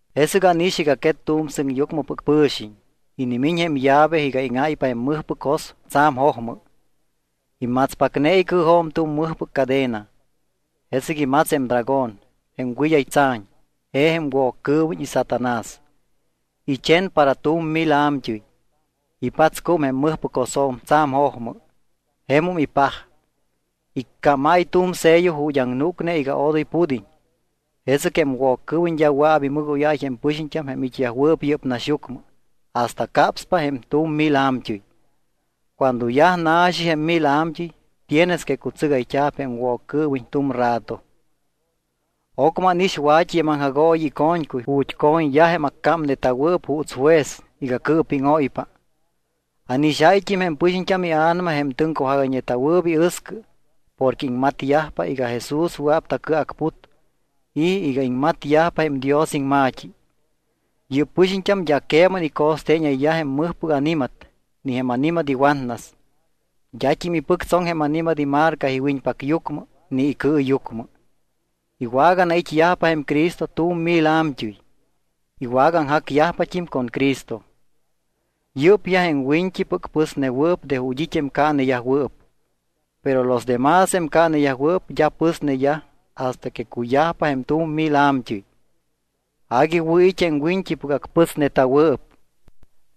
Jesɨc ánix iga quet tu̱m sɨŋyucmɨpɨc pɨ̱xiñ. Inimiñ jém llave iga íŋáypa jém mɨjpɨc jos tsa̱m jojmɨ. Imatspacne icɨɨjo̱m tu̱m mɨjpɨc cadena. Jesɨc imats jém dragón, jém wɨd́ay tsa̱ñ, je jém Woccɨɨwiñ y Satanás. Ichen para tu̱m mil a̱mt́ɨy. Ipatscúm jém mɨjpɨc josjo̱m tsa̱m jojmɨ. Jemum ipaj. Iccámáy tu̱m sello ju̱t́ aŋnúcne iga odoy pud́iñ. Jesɨc jém Woccɨɨwiñ d́a wɨa̱p imɨgóyáy jém pɨxiñt́am jém it́yajwɨɨp yɨ́p naxyucmɨ hasta capspa jém tu̱m mil a̱mt́ɨy. Cuando yaj na̱xi jém mil a̱mt́ɨy tienes que cutsɨgayt́a̱p jém Woccɨɨwiñ tu̱m rato. Ocmɨ ánix wa̱t́i jém aŋjagooyi ico̱ñcuy ju̱t́ co̱ñyaj jém accámneta̱wɨɨp juuts juez iga cɨɨpíŋóypa. Ánixáyt́im jém pɨxiñt́am ia̱nama jém tɨŋcujagayñeta̱wɨɨp iɨscɨ porque iŋmatyajpa iga Jesús wɨa̱p tacɨacput y iga iŋmatyajpa jém Dios iŋma̱t́i. Yɨ́p pɨxiñt́am d́a queman ico̱steeñayyaj jém mɨjpɨc ani̱mat ni jém ani̱mat iwatnas. D́at́im ipɨctsoŋ jém ani̱mat imarca iwiñpacyucmɨ ni icɨɨyucmɨ. Iwaganait́yajpa jém Cristo tu̱m mil a̱mt́ɨy. Iwagaaŋjacyajpat́im con Cristo. Yɨ́pyaj jém wiñt́ipɨc pɨsnewɨɨp de ju̱t́ it́ jém caaneyajwɨɨp. Pero los de más jém caaneyajwɨɨp d́a pɨsneyaj hasta que cuyajpa jém tu̱m mil a̱mt́ɨy. Agui wɨ̱ it́ jém wiñt́ipɨc acpɨsneta̱wɨɨp.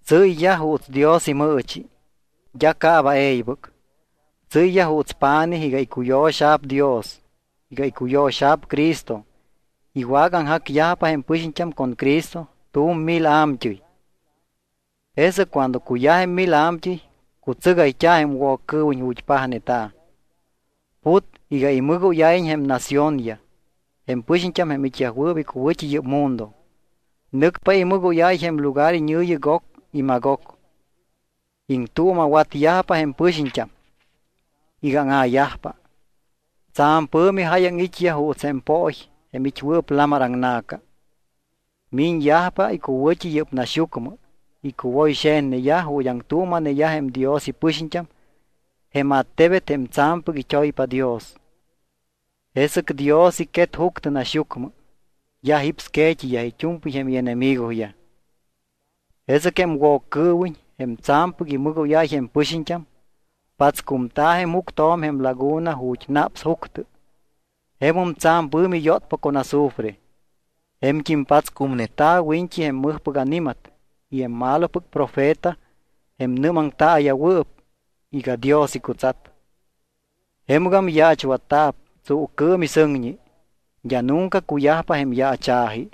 Tsɨ́yyaj juuts Dios imɨɨchi. D́a caaba e̱ybɨc. Tsɨ́yyaj juuts pa̱nij iga icuyo̱xa̱p Dios, iga icuyo̱xa̱p Cristo. Iwagaaŋjacyajpa jém pɨxiñt́am con Cristo tu̱m mil a̱mt́ɨy. Jesɨc cuando cuyaj jém mil a̱mt́ɨy, cutsɨgayt́a̱ jém Woccɨɨwiñ ju̱t́ pajneta̱. Put iga imɨgóyáyiñ jém naciónyaj, jém pɨxiñt́am jém it́yajwɨɨp icuwɨ̱t́i yɨ́p mundo. Nɨcpa imɨgóyáy jém lugar iñɨ̱yi Gog y Magog. Iŋtuuma̱watyajpa jém pɨxiñt́am iga áŋa̱yajpa. Tsa̱m pɨ̱mi jáyaŋ it́yaj juuts jém pooy jém it́wɨɨp lamar aŋna̱ca. Miñyajpa icuwɨ̱t́i yɨ́p naxyucmɨ. Icuwoyxe̱tneyaj ju̱t́ aŋtuuma̱neyaj jém Dios ipɨxiñt́am jém attebet jém tsa̱mpɨc it́oypa Dios. Jesɨc Dios icquet juctɨ naxyucmɨ. Yaj jípsque̱t́iyaj it́u̱mpɨy jém ienemigoyaj. Jesɨc jém Woccɨɨwiñ, jém tsa̱mpɨc imɨgóyáy jém pɨxiñt́am, patscumta̱ jém juctjo̱m jém laguna ju̱t́ naps juctɨ, jemum tsa̱m pɨ̱mi yótpa con azufre. Je̱mt́im patscumneta̱ wiñt́i jém mɨjpɨc ani̱mat y jém malopɨc profeta jém nɨ́maŋtaaya̱wɨɨp iga Dios icutsat. Jemɨgam yaachwatta̱p tsuucɨɨm y sɨŋñi. D́a nunca cuyajpa jém yaacha̱ji.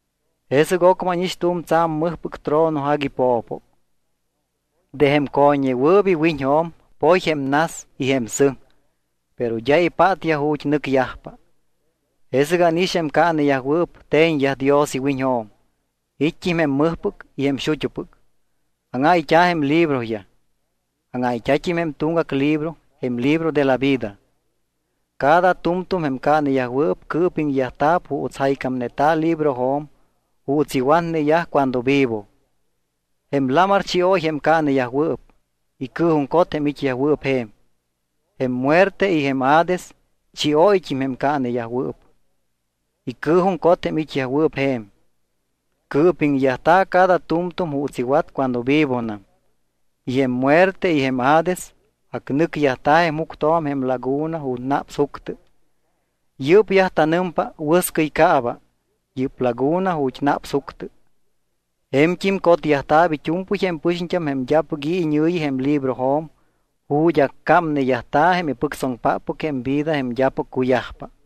Jesɨc ocmɨ ánix tu̱m tsa̱m mɨjpɨc trono agui po̱po. De jém co̱ññewɨɨp iwiñjo̱m poy jém nas y jém sɨŋ, pero d́a ipátyaj ju̱t́ nɨcyajpa. Jesɨc ánix jém caaneyajwɨɨp te̱ñyaj Dios iwiñjo̱m. It́t́im jém mɨjpɨc y jém xut́upɨc. Áŋáyt́a̱ jém libroyaj. Áŋáyt́a̱t́im jém tuŋgac libro, jém libro de la vida. Cada tu̱mtu̱m jém caaneyajwɨɨp cɨɨpiŋyajta̱p juuts jaycámneta̱ librojo̱m juuts iwatneyaj cuando vivo. Jém lamar chióy jém caaneyajwɨɨp, icɨɨjuŋcot jém it́yajwɨɨp je̱m. Jém muerte y jém Hades chióyt́im jém caaneyajwɨɨp. Icɨɨjuŋcot jém it́yajwɨɨp je̱m. Cɨɨpiŋyajta̱ cada tu̱mtu̱m juuts iwat cuando vivonam. Y jém muerte y jém Hades acnɨcyajta̱ jém juctjo̱m jém laguna ju̱t́ naps juctɨ. Yɨ́pyaj tanɨmpa wɨscɨy caaba, yɨ́p laguna ju̱t́ naps juctɨ. Je̱mt́im cotyajta̱p it́u̱mpɨy jém pɨxiñt́am jém d́apɨc i̱ iñɨ̱yi jém librojo̱m ju̱t́ accámneyajta̱ jém ipɨctsoŋpáppɨc jém vida jém d́apɨc cuyajpa.